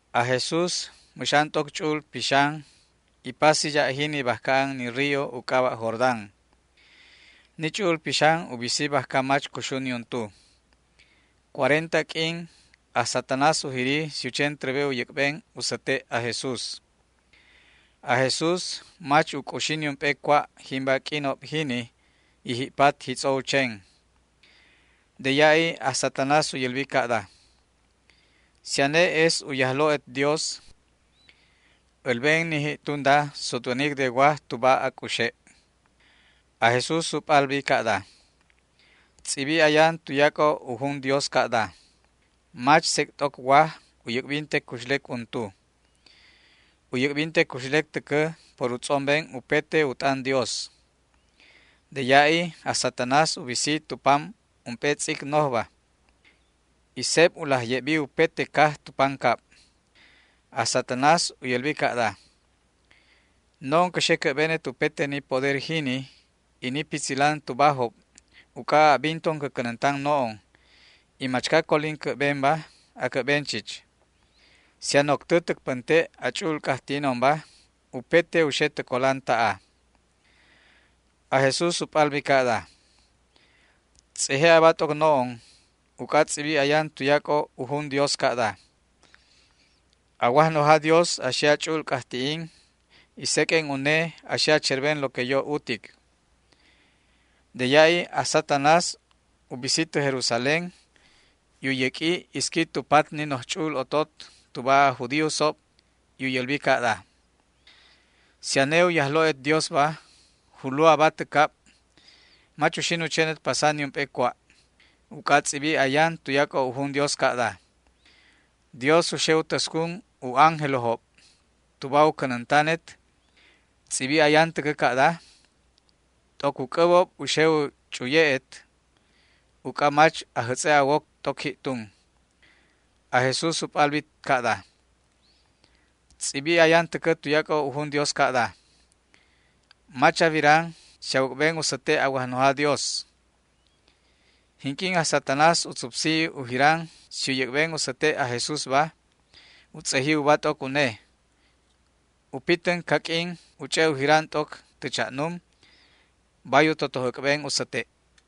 Aj Jesús mäx an t'oc Ch'u'ul Pixan y pasi ya' jini bajca an ni río u c'aba' Jordán. Ni Ch'u'ul Pixan u bisi bajca mach cuxu niuntu. Cuarenta q'uin aj Satanás u jiri si u chen trebe u yäc'ben u säte' aj Jesús. Aj Jesús mach u c'uxi niump'e cua' jimba q'uinob jini y ji'pat jitz'o u chen. De ya'i aj Satanás u yälbi ca'da: ―Si ane es u Yajlo'et Dios, älben ni ji'tunda sutwänic de waj tuba a c'uxe'. Aj Jesús u p'albi ca'da: ―Tz'ibi ayan tuyac'o u jun Dios ca'da: “Mach sec' t'oc waj u yäc'binte cuxlec untu. U yäc'binte cuxlec täcä por u tz'omben upete u t'an Dios”. De ya'i aj Satanás u bisi tu pam ump'e tz'ic nojba, y seb u laj ye'bi upete caj tu pancab. Aj Satanás u yälbi ca'da: ―No'on cä xe cä'benet upete ni poder jini y ni pitzilan tubajob uc'a a'binton cä cänäntan no'on, y machca colin cä'benba, acä'ben chich. Si a noctä täc pänte' a ch'u'ul c'ajti'inonba upete u xe tä colan ta'a. Aj Jesús u p'albi ca'da: ―Tz'eje aba t'oc no'on uc'a tz'ibi ayan tuyac'o u jun Dios ca'da: “A Wajnoja Dios a xe a ch'u'ul c'ajti'in y seq'uen Une a xe a cherben lo que yo utic”. De ya'i aj Satanás u bisi tä Jerusalén y u yäq'ui isqui tu pat ni noj ch'u'ul otot tuba aj judíosob y u yälbi ca'da: ―Si ane u Yajlo'et Diosba, julu aba tä cab. Mach uxin u chenet pasa niump'e cua', uc'a tz'ibi ayan tuyac'o u jun Dios ca'da: Dios u xe u täscun u ángelojob tuba u cänäntanet. Tz'ibi ayan täcä ca'da: T'oc u c'äbob u xe u ch'uye'et uc'a mach a jätz'e' a woc t'oc ji'tun. Aj Jesús u p'albi ca'da: ―Tz'ibi ayan täcä tuyac'o u jun Dios ca'da: “Mach a wiran si a wäc'ben u säte' a Wajnoja Dios”. Jinq'uin aj Satanás u tzupsi u jiran si u yäc'ben u säte' aj Jesúsba u tz'eji uba t'oc une, u pitän caq'uin u ch'e' u jiran t'oc tä cha'num, bay u totoj äc'ben u säte'.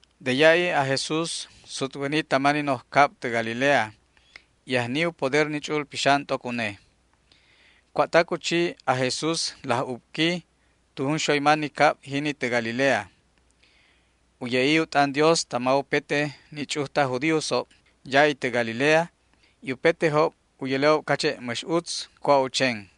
De ya'i aj Jesús sutwäni tama ni noj cab tä Galilea, y ajni u poder ni Ch'u'ul Pixan t'oc une. Cua'tac u chi aj Jesús laj ubqui tu junxoyma ni cab jini tä Galilea. U ye'i u t'an Dios tama upete ni ch'uj taj judíosob ya'i tä Galilea, y upetejob u yäle'ob cache' mäx utz cua' u chen.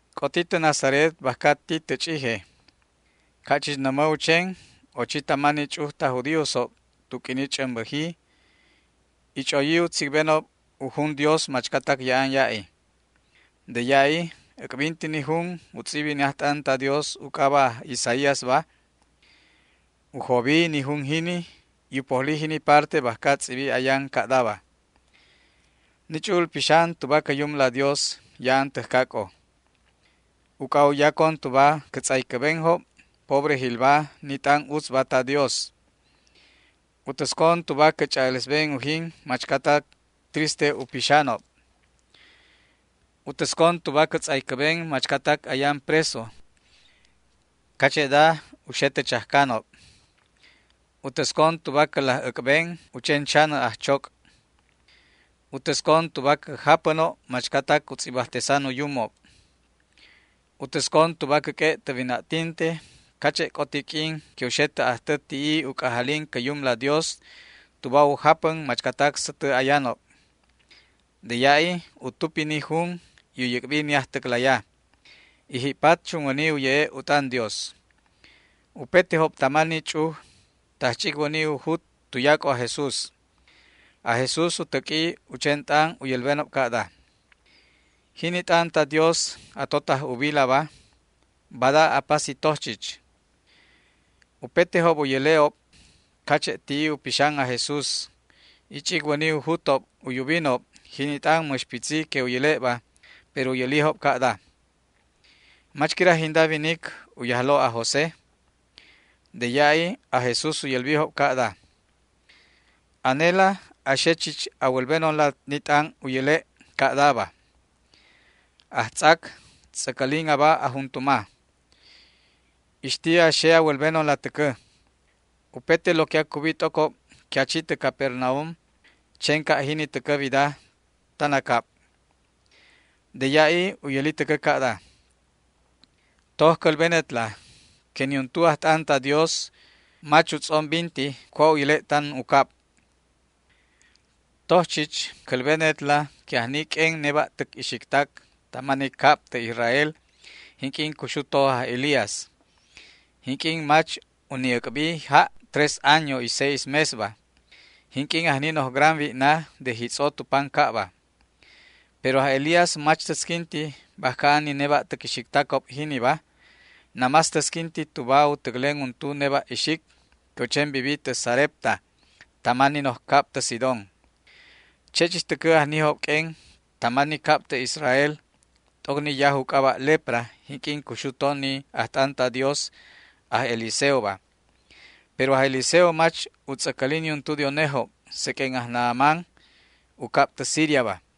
C'oti tä Nazaret bajca ti tä ch'ije. Ca' chich nämä u chen, ochi tama ni ch'uj taj judíosob tu q'uini ch'ämbäji y ch'oyi u tzicbenob u jun Dios machcatac ya'an ya'i. De ya'i äc'binti ni jun u tz'ibi ni ajt'an ta Dios u c'aba' aj Isaíasba. U jobi ni jun jini y u pojli jini parte bajca tz'ibi ayan ca'daba: Ni Ch'u'ul Pixan tuba cä Yumla Dios ya'an täjcac'o, uc'a u yacon tuba cä tz'aycäbenjob pobrejilba ni t'an utzba ta Dios. U täscon tuba cä ch'a'alesben ujin machcatac triste u pixanob. U täscon tuba cä tz'aycäben machcatac ayan preso cache'da u xe tä chajcanob. U täscon tuba cä laj äc'ben u chen chanä ajchoc'. U täscon tuba cä japänob machcatac u tz'ibajtesan u yumob. U täscon tuba cäq'ue' tä wina'tinte cache' c'oti q'uin que u xe tä ajtä ti'i u c'ajalin cä Yumla Dios tuba u japän machcatac sätä ayanobba. De ya'i u tupi ni jun y u yäc'bi ni ajtäclaya, y ji'pat chunwäni u ye'e' u t'an Dios. Upetejob tama ni ch'uj tajch'icwäni u jut tuyac'o aj Jesús. Aj Jesús u täq'ui u chen t'an u yälbenob ca'da: ―Jini t'an ta Dios a totaj ubilaba, bada apasi toj chich. Upetejob u yäle'job cache' ti'i u pixan aj Jesús, y ch'icwäni u jutob u yubinob jini t'an mäx pitzi que u yäle'ba, pero u yälijob ca'da: ―¿Mach quira jinda winic u yajlo' aj José? De ya'i aj Jesús u yälbijob ca'da: ―Anela a xe chich a wälbenonla ni t'an u yäle' ca'daba: “Ajtz'ac, tz'äcälin aba a juntuma”. Ixti a xe a wälbenonla täcä: “Upete lo que acubi t'ocob que a chi tä Capernaum, chen ca' jini täcä wida tan a cab”. De ya'i u yäli täcä ca'da: ―Toj cälbenetla que niuntu ajt'an ta Dios mach utz'ombinti cua' u yäle' tan u cabba. Toj chich cälbenetla que ajni q'uen neba'täc ixictac tama ni cab tä Israel jinq'uin cuxu to aj Elías, jinq'uin mach u ni' äc'bi ja' tres año y seis mesba, jinq'uin ajni noj gran wi'na de jitz'o tu pancabba. Pero aj Elías mach täsquinti bajca an ni neba'täc ixictacob jiniba, namás tasquinti tuba u täclen untu neba' ixic que u chen vivi tä Sarepta tama ni noj cab tä Sidón. Che' chich täcä ajnijob q'uen tama ni cab tä Israel t'oc ni yaj u c'aba' lepra jinq'uin cuxu to ni ajt'an ta Dios aj Eliseoba, pero aj Eliseo mach u tz'äcäli niuntu de unejob seq'uen aj Naamán, u cab tä Siriaba.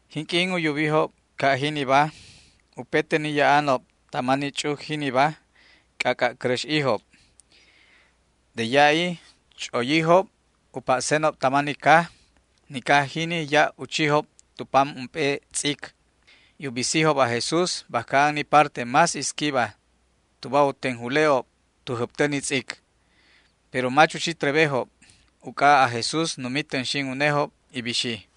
Jinq'uin u yubijob ca' jiniba, upete ni ya'anob tama ni ch'uj jiniba, c'ac'a' cäräx'ijob. De ya'i ch'oyijob u pa'senob tama ni caj. Ni caj jini ya' u chijob tu pam ump'e tz'ic, y u bisijob aj Jesús bajca an ni parte más isquiba tuba u tenjule'ob tu jäbtä ni tz'ic. Pero mach u chi trebejob uc'a aj Jesús numi tänxin unejob y bixi.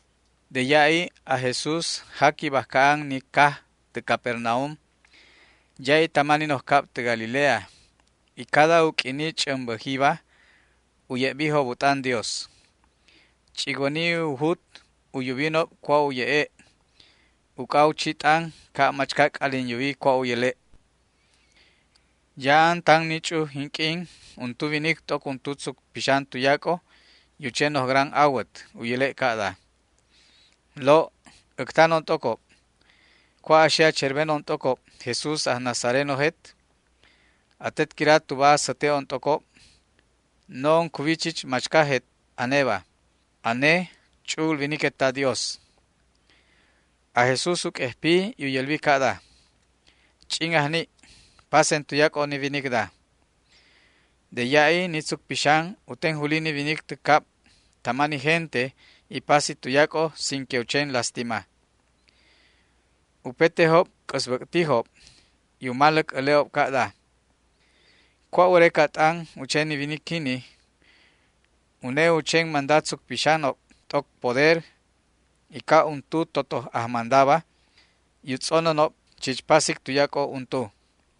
De ya'i aj Jesús jaqui bajca an ni caj tä Capernaum, ya'i tama ni noj cab tä Galilea, y cada u q'uini ch'ämbäjiba u ye'bijob u t'an Dios. Ch'icwäni u jut u yubinob cua' u ye'e', uc'a u chi t'an ca' machca c'alin yuwi cua' u yäle'. Ya'an tan ni ch'uj jinq'uin untu winic t'oc untu tzuc pixan tuyac'o y u chen noj gran awät. U yäle' ca'da: ―Lo', äctanon t'ocob. ¿Cua' a xe a cherbenon t'ocob, Jesús aj nazarenojet? ¿Atet quira tuba a säte'on t'ocob? No'on cuwi chich machcajet aneba. Ane Ch'u'ul Winiquet ta Dios. Aj Jesús u q'uejpi y u yälbi ca'da: ―¡Ch'in ajni', pasen tuyac'o ni winicda! De ya'i ni tzuc pixan u tenjuli ni winic tä cab tama ni gente y pasi tuyac'o sin que u chen lastima. Upetejob c'äsbäc'tijob y u maläc äle'ob ca'da: ―¿Cua' wäreca t'an u chen ni winic jini? Une u chen manda tzuc pixanob t'oc poder y ca' untu totoj ajmandaba, y u tz'onänob chich pasic tuyac'o untu.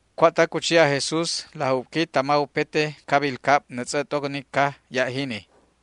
Cua'tac u chi aj Jesús laj ubqui tama upete cabil cab nätz'ä t'oc ni caj ya' jini.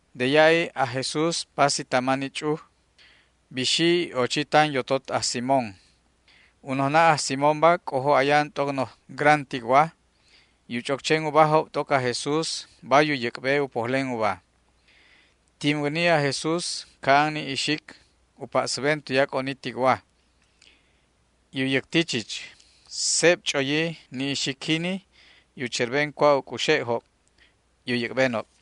De ya'i aj Jesús pasi tama ni ch'uj. Bixi y ochi tan yotot aj Simón. U nojna' aj Simónba c'ojo ayan t'oc noj gran ticwa, y u ch'oc chen ubajob t'oc aj Jesús bay u yäc'be u pojlen uba. Tinwäni aj Jesús ca'an ni ixic u pa'säben tuyac'o ni ticwa, y u yäcti chich. Seb ch'oyi ni ixic jini y u cherben cua' u c'uxe'job y u yäc'benob.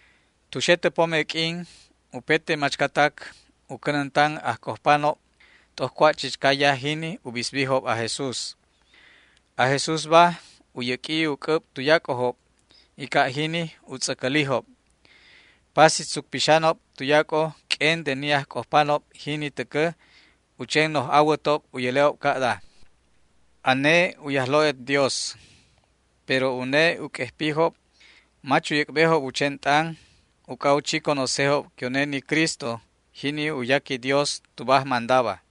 Tu xe tä pome q'uin upete machcatac u cänäntan ajc'ojpanob t'oc cua' chichca yaj jini u bisbijob aj Jesús. Aj Jesúsba u yäq'ui u c'äb tuyac'ojob y ca' jini u tz'äcälijob. Pasi tzuc pixanob tuyac'o q'uen de ni ajc'ojpanob jini täcä u chen noj awätob u yäle'ob ca'da: ―Ane u Yajlo'et Dios. Pero une u q'uejpijob, mach u yäc'bejob u chen t'an, uc'a u chi conocejob que une ni Cristo, jini u yaqui Dios tuba ajmandaba.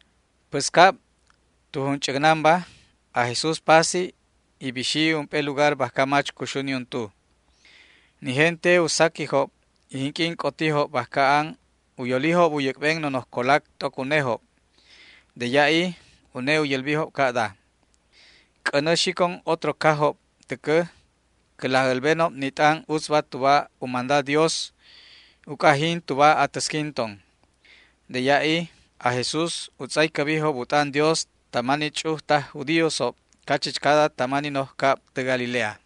Päscab tu junch'äcnanba aj Jesús pasi y bixi ump'e lugar bajca mach cuxu niuntu. Ni gente u saquijob y jinq'uin c'otijob bajca an u yolijob u yäc'ben nonoj colac t'oc unejob. De ya'i une u yälbijob ca'da: ―C'änä xicon otro cajob täcä cä laj älbenob ni t'an utzba tuba u manda Dios, uc'a jin tuba atäsquinton. De ya'i aj Jesús u tz'aycäbijob u t'an Dios tama ni ch'uj taj judíosob cachichcada tama ni noj cab tä Galilea.